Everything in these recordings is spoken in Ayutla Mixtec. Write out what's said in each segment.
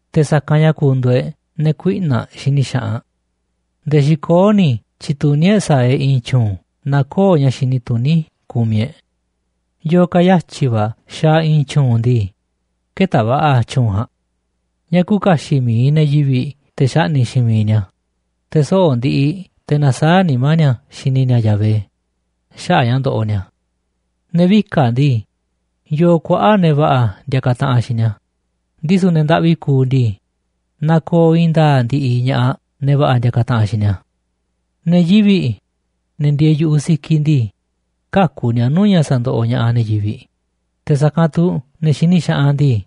te̱ sa̱kanꞌ ña̱ ku̱ndu̱u̱ e̱ꞌ ne̱ kuiꞌna̱ꞌ xini xaꞌanꞌ. Nde̱e̱ xikoó ni̱ tyi̱tuní e̱ꞌ sa̱a̱ e̱ꞌ i̱i̱n tyu̱u̱n naaꞌ köo̱ꞌ ña̱ xini tuní kumiꞌ e̱ꞌ. Yo̱o̱ ka̱ yatyi̱ va̱ xaaꞌ i̱i̱n tyu̱u̱n ndii, kë̱ta̱ va̱ꞌa̱ tyu̱u̱n ja̱a̱nꞌ. Ña̱ küuꞌ kaxiꞌ mi̱iꞌ ne̱ yivi̱ꞌ te̱ xaꞌni̱ꞌ xiinꞌ mi̱iꞌ ni̱a̱, te̱ soꞌo̱ꞌ ndiꞌiꞌ te̱ nasaáꞌ nimá ni̱a̱ xini ni̱a̱ Yahvé xaꞌa̱ꞌ ña̱ ndoꞌoꞌ ni̱a̱. Ne̱ vika̱ꞌ ndii, yoo kuaꞌa̱ꞌ ne̱ va̱ꞌa̱ ndiakaꞌ taꞌanꞌ xiinꞌ ni̱a̱, ndisu̱ ne̱ ndaꞌvi kuuꞌ ndii, nakooꞌ i̱i̱n nda̱a̱ꞌ ndiꞌiꞌ ña̱ꞌaꞌ ne̱ va̱ꞌa̱ ndiakaꞌ taꞌanꞌ xiinꞌ ni̱a̱. Ne̱ yivi̱ꞌ, ne̱ ndieeꞌ yu̱ꞌuꞌ sikiꞌ ndii, käku̱ ni̱a̱ nuu̱ꞌ ña̱ sa̱ndoꞌoꞌ ña̱ꞌaꞌ ne̱ yivi̱ꞌ, te̱ sa̱kanꞌ tu̱ ne̱ xini xaꞌanꞌ ndii,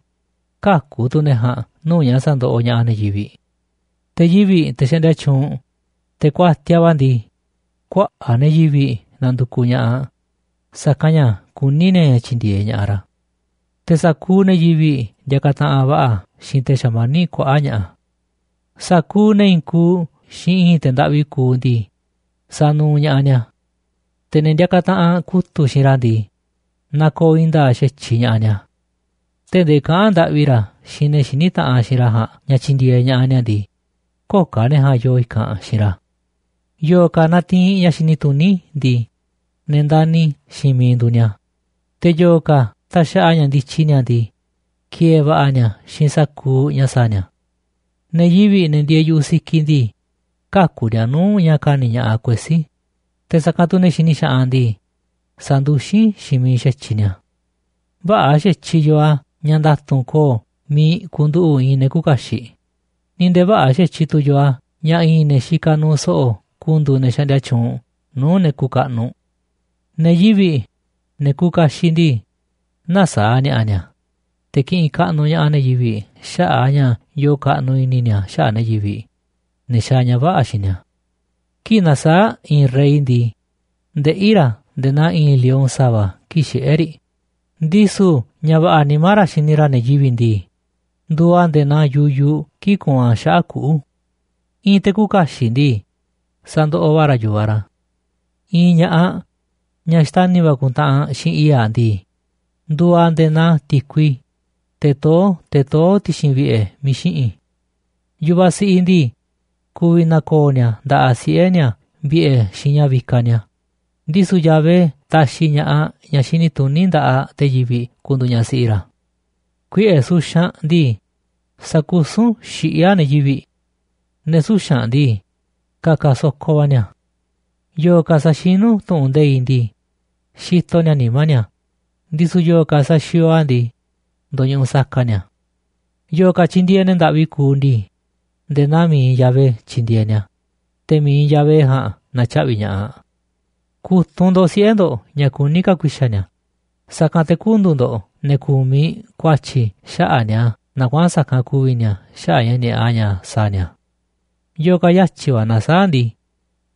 käku̱ tu̱ ne̱ ja̱a̱nꞌ nuu̱ꞌ ña̱ sa̱ndoꞌoꞌ ña̱ꞌaꞌ ne̱ yivi̱ꞌ. Te̱ yivi̱ꞌ, te̱ xaꞌndia tyuunꞌ, te̱ kuatiaꞌ va̱ ndii, kuaꞌa̱ꞌ ne̱ yivi̱ꞌ nandukuꞌ ña̱ꞌaꞌ, sa̱kanꞌ ña̱ kuní ni̱a̱ ña̱ tyi̱ndi̱e̱eꞌ ña̱ꞌaꞌ ra̱. Te̱ sa̱kuuꞌ ne̱ yivi̱ꞌ ndiakaꞌ taꞌanꞌ va̱ꞌa̱ xiinꞌ te̱ xamaníꞌ kuaꞌa̱ꞌ ña̱ꞌa̱. Sa̱kuuꞌ ne̱ i̱i̱n kuuꞌ xiinꞌ i̱i̱n te̱ ndaꞌvi kuuꞌ ndii, sanuuꞌ ña̱ꞌaꞌ ni̱a̱. Te̱ ne̱ ndiakaꞌ taꞌanꞌ kutu̱ꞌ xiinꞌ ra̱ ndii, nakooꞌ i̱i̱n nda̱a̱ꞌ xa̱tyiꞌ ña̱ꞌaꞌ ni̱a̱. Tee̱ꞌ ndee kaꞌa̱n ndaꞌvi ra̱ xiinꞌ ne̱ xiní taꞌanꞌ xiinꞌ ra̱ ja̱a̱nꞌ ña̱ tyi̱ndi̱e̱eꞌ ña̱ꞌaꞌ ni̱a̱ ndii, köo̱ꞌ ka̱ ne̱ ja̱a̱nꞌ yoo i̱kanꞌ xiinꞌ ra̱. Yo̱o̱ ka̱ natiinꞌ ña̱ xini tuní ndii, ne̱ ndani̱ xiinꞌ miiꞌ nduuꞌ ni̱a̱, te̱ yo̱o̱ ka̱ taxaꞌa ña̱ ndityi ni̱a̱ ndii, ki̱e̱e̱ va̱ꞌa̱ ni̱a̱ xiinꞌ sa̱kuuꞌ ña̱ sa̱a̱ ni̱a̱. Ne̱ yivi̱ꞌ, ne̱ ndieeꞌ yu̱ꞌuꞌ sikiꞌ ndii, käku̱ ni̱a̱ nuu̱ꞌ ña̱ ka̱ni̱ ña̱ꞌaꞌ kuesí, te̱ sa̱kanꞌ tu̱ ne̱ xini xaꞌanꞌ ndii, sa̱nduxín xiinꞌ miiꞌ xa̱tyiꞌ ni̱a̱. Vä̱ꞌa̱ xa̱tyiꞌ yoo a̱ ña̱ nda̱tu̱nꞌ ko̱o̱ miiꞌ ku̱nduꞌu̱ꞌ i̱i̱n ne̱ küuꞌ kaxiꞌ, ni̱ nde̱e̱ vä̱ꞌa̱ xa̱tyiꞌ tu̱ yoo a̱ ña̱ i̱i̱n ne̱ xikaꞌ nuuꞌ so̱ꞌo̱ ku̱ndu̱u̱ ne̱ xaꞌndia tyuunꞌ nuu̱ꞌ ne̱ kuuꞌ kaꞌnuꞌ. Ne̱ yivi̱ꞌ, ne̱ kuuꞌ kaxiꞌ ndii, näsaáꞌ ni̱a̱ꞌa̱ ni̱a̱, te̱ kiꞌinꞌ kaꞌnuꞌ ña̱ꞌaꞌ ne̱ yivi̱ꞌ xaꞌa̱ꞌ a̱ ña̱ yoo kaꞌnuꞌ i̱ni̱ ni̱a̱ xaꞌa̱ꞌ ne̱ yivi̱ꞌ, ne̱ xaaꞌ ña̱ vä̱ꞌa̱ xiinꞌ ni̱a̱. Kii̱ꞌ nasaáꞌ i̱i̱n rey ndii, ndeꞌí ra̱ nde̱e̱ naa i̱i̱n lion sa̱va̱ kii̱ꞌ xiꞌé riꞌ, ndisu̱ ña̱ va̱ꞌa̱ nimá ra̱ xini ra̱ ne̱ yivi̱ꞌ ndii, nduuꞌ a̱ nde̱e̱ naa yuyuꞌ kii̱ꞌ kuunꞌ a̱ xaꞌa̱ꞌ kuꞌu̱. I̱i̱n te̱ küuꞌ kaxiꞌ ndii, sandoꞌoꞌ va̱ ra̱ yu̱vaꞌ ra̱. I̱i̱n ña̱ꞌaꞌ, ñaꞌ xtani̱ va̱ ku̱ntaꞌanꞌ xiinꞌ i̱i̱ꞌ aꞌ ndii, nduuꞌ aꞌ nde̱e̱ naa ti̱kui, teꞌ toó te̱ toó ti̱xi̱n vi̱ꞌe̱ miiꞌ xiꞌi̱n. Yu̱vaꞌ siꞌiꞌ ndii, ku̱vi̱ na̱ko̱o̱ ni̱a̱ nda̱ꞌaꞌ siꞌe̱ ni̱a̱ vi̱ꞌe̱ xiinꞌ ña̱ vikaꞌ ni̱a̱, ndisu̱ Yahvé taxiꞌ ña̱ꞌaꞌ ñaꞌ xini tuní nda̱ꞌaꞌ te̱ yivi̱ꞌ ku̱ndu̱u̱ ñaꞌ siꞌi ra̱. Kuiꞌe̱ suxanꞌ ndii, sakusún xiꞌí a̱ ne̱ yivi̱ꞌ. Ne̱ suxa̱nꞌ ndii, ka̱ka̱ so̱ko va̱ ni̱a̱. Yo̱o̱ ka̱ saxinú tu̱ꞌu̱n nde̱iꞌ ndii, xitoꞌ ni̱a̱ nimá ni̱a̱, ndisu̱ yo̱o̱ ka̱ saxiooꞌ a̱ ndii, ndo̱ñuꞌuꞌ saka ni̱a̱. Yo̱o̱ ka̱ tyindieeꞌ ne̱ ndaꞌvi kuuꞌ ndii, nde̱e̱ naa mi̱iꞌ Yahvé tyindieeꞌ ni̱a̱, te̱ mi̱iꞌ Yahvé ja̱a̱nꞌ na̱tyaꞌvi̱ ña̱ꞌaꞌ. Ku̱tunꞌ ndo̱ꞌ siꞌe̱ ndo̱ꞌ ña̱ kuní ka̱ ku̱i̱xa̱ ni̱a̱, sa̱kanꞌ te̱ kü̱ndu̱u̱ ndo̱ꞌ ne̱ ku̱miꞌ ku̱a̱tyi̱ xaꞌa̱ꞌ ni̱a̱ naaꞌ kuaꞌa̱n sa̱kanꞌ ku̱vi̱ ni̱a̱ xaꞌa̱ꞌ ña̱ ni̱a̱ꞌa ña̱ sa̱a̱ ni̱a̱. Yo̱o̱ ka̱ yatyi̱ va̱ nasaáꞌ ndii,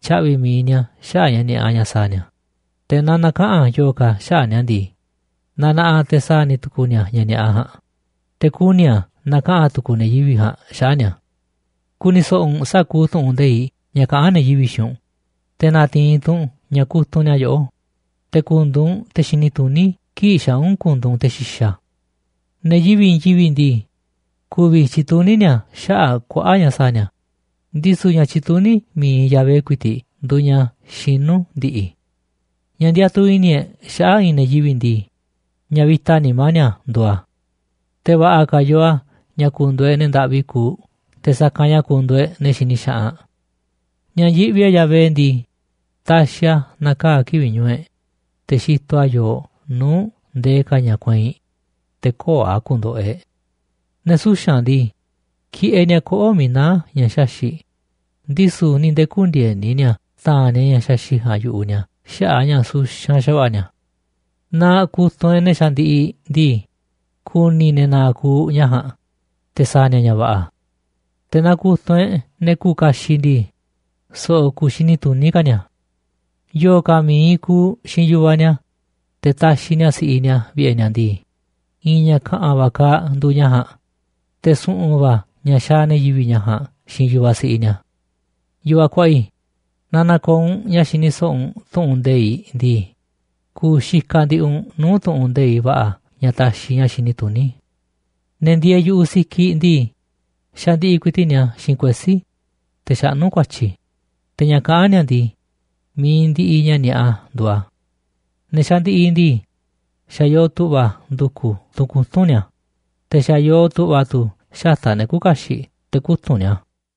tya̱ꞌvi̱ mi̱iꞌ ni̱a̱ xaꞌa̱ꞌ ña̱ ni̱a̱ꞌa ña̱ sa̱a̱ ni̱a̱, te̱ naaꞌ na̱kaꞌa̱n yo̱o̱ ka̱ xaꞌa̱ꞌ ni̱a̱ ndii, nanaꞌaꞌ te̱ sa̱a̱ ni̱ tu̱ku̱u̱ ni̱a̱ ña̱ ni̱a̱ꞌa ja̱a̱nꞌ, te̱ kuni̱ a̱ na̱kaꞌa̱n tu̱ku̱u̱ ne̱ yivi̱ꞌ ja̱a̱nꞌ xaꞌa̱ꞌ ni̱a̱. Ku̱ni̱ so̱ꞌo̱ u̱nꞌ sa̱kuuꞌ tu̱ꞌu̱n nde̱iꞌ ña̱ kaꞌán ne̱ yivi̱ꞌ xiinꞌ u̱nꞌ, te̱ na̱ti̱i̱n tu̱ u̱nꞌ ña̱ kutunꞌ ni̱a̱ yoꞌó, te̱ ku̱ndu̱u̱ u̱nꞌ te̱ xini tuní kii̱ꞌ xaa̱ u̱nꞌ ku̱ndu̱u̱ u̱nꞌ te̱ xi̱xa̱. Ne̱ yivi̱ꞌ i̱i̱n yivi̱ꞌ ndii, ku̱vi̱ tyi̱tuní ni̱a̱ xaꞌa̱ꞌ kuaꞌa̱ꞌ ña̱ sa̱a̱ ni̱a̱, ndisu̱ ña̱ tyituní mi̱iꞌ Yahvé ku̱i̱ti̱ꞌ nduuꞌ ña̱ xinú ndi̱ꞌi̱. Ña̱ ndiatuꞌ i̱ni̱ e̱ꞌ xaꞌa̱ꞌ i̱i̱n ne̱ yivi̱ꞌ ndii, ña̱ vi̱ta nimá ni̱a̱ nduuꞌ a̱. Te̱ va̱ꞌa̱ ka̱ yoo a̱ ña̱ ku̱ndu̱u̱ e̱ꞌ ne̱ ndaꞌvi kuuꞌ te̱ sa̱kanꞌ ña̱ ku̱ndu̱u̱ e̱ꞌ ne̱ xini xaꞌanꞌ. Ña̱ yiꞌvi e̱ꞌ Yahvé ndii, taxiꞌ a̱ na̱kaa̱ kivi̱ꞌ ñu̱u̱ e̱ꞌ, te̱ xitoꞌ a̱ yooꞌ nuu̱ꞌ ndee ka̱ ña̱ kueinꞌ, te̱ köo̱ꞌ a̱ ku̱ndo̱ꞌo̱ e̱ꞌ. Ne̱ suxa̱nꞌ ndii, kiꞌeꞌ ni̱a̱ koꞌo̱ꞌ miiꞌ naá ña̱ xaxi̱ꞌ, ndisu̱ ni̱ nde̱e̱ kündieni ni̱a̱ ta̱a̱nꞌ ni̱a̱ ña̱ xaxi̱ꞌ ja̱a̱nꞌ yu̱ꞌuꞌ ni̱a̱ xaꞌa̱ꞌ a̱ ña̱ suxanꞌ xa̱va̱ꞌa̱ ni̱a̱. Naaꞌ ku̱tunꞌ e̱ꞌ ne̱ xandiꞌiꞌ ndii, ku̱ni̱ ne̱ na̱a̱ꞌ ku̱u̱ ña̱ ja̱a̱nꞌ, te̱ sa̱a̱ ni̱a̱ ña̱ va̱ꞌa̱. Te̱ naaꞌ ku̱tunꞌ e̱ꞌ ne̱ kuuꞌ kaxiꞌ ndii, so̱ꞌo̱ ku̱u̱ xini tuní ka̱ ni̱a̱. Yo̱o̱ ka̱ mi̱iꞌ kuuꞌ xiinꞌ yu̱vaꞌ ni̱a̱, te̱ taxiꞌ ni̱a̱ si̱ꞌiꞌ ni̱a̱ vi̱ꞌe̱ ni̱a̱ ndii, i̱i̱n ña̱ ka̱ꞌa̱n va̱ kaaꞌ nduuꞌ ña̱ ja̱a̱nꞌ, te̱ su̱ꞌu̱n va̱ ña̱ xaaꞌ ne̱ yivi̱ꞌ ña̱ ja̱a̱nꞌ xiinꞌ yu̱vaꞌ siꞌiꞌ ni̱a̱. Yu̱vaꞌ kuaꞌa i̱, naaꞌ na̱ko̱o̱ u̱nꞌ ña̱ xini so̱ꞌo̱ u̱nꞌ tu̱ꞌu̱n nde̱iꞌ ndii, ku̱u̱ xikaꞌ ndiꞌiꞌ u̱nꞌ nuu̱ꞌ tu̱ꞌu̱n nde̱iꞌ va̱ꞌa̱ ña̱ taxiꞌ ña̱ xini tuní. Ne̱ ndieeꞌ yu̱ꞌuꞌ sikiꞌ ndii, xandiꞌiꞌ ku̱i̱ti̱ꞌ ni̱a̱ xiinꞌ kuesí, te̱ xaꞌnú ku̱a̱tyi̱, te̱ ña̱ kaꞌán ni̱a̱ ndii, mi̱iꞌ ndiꞌiꞌ ña̱ ni̱a̱ꞌa nduuꞌ a̱. Ne̱ xandiꞌiꞌ ndii, xa̱ yoo tu̱ꞌva̱ ndu̱ku̱ tunꞌ kutu̱nꞌ ni̱a̱, te̱ xa̱ yoo tu̱ꞌva̱ tu̱ xata̱ꞌ ne̱ küuꞌ kaxiꞌ te̱ kutu̱nꞌ ni̱a̱.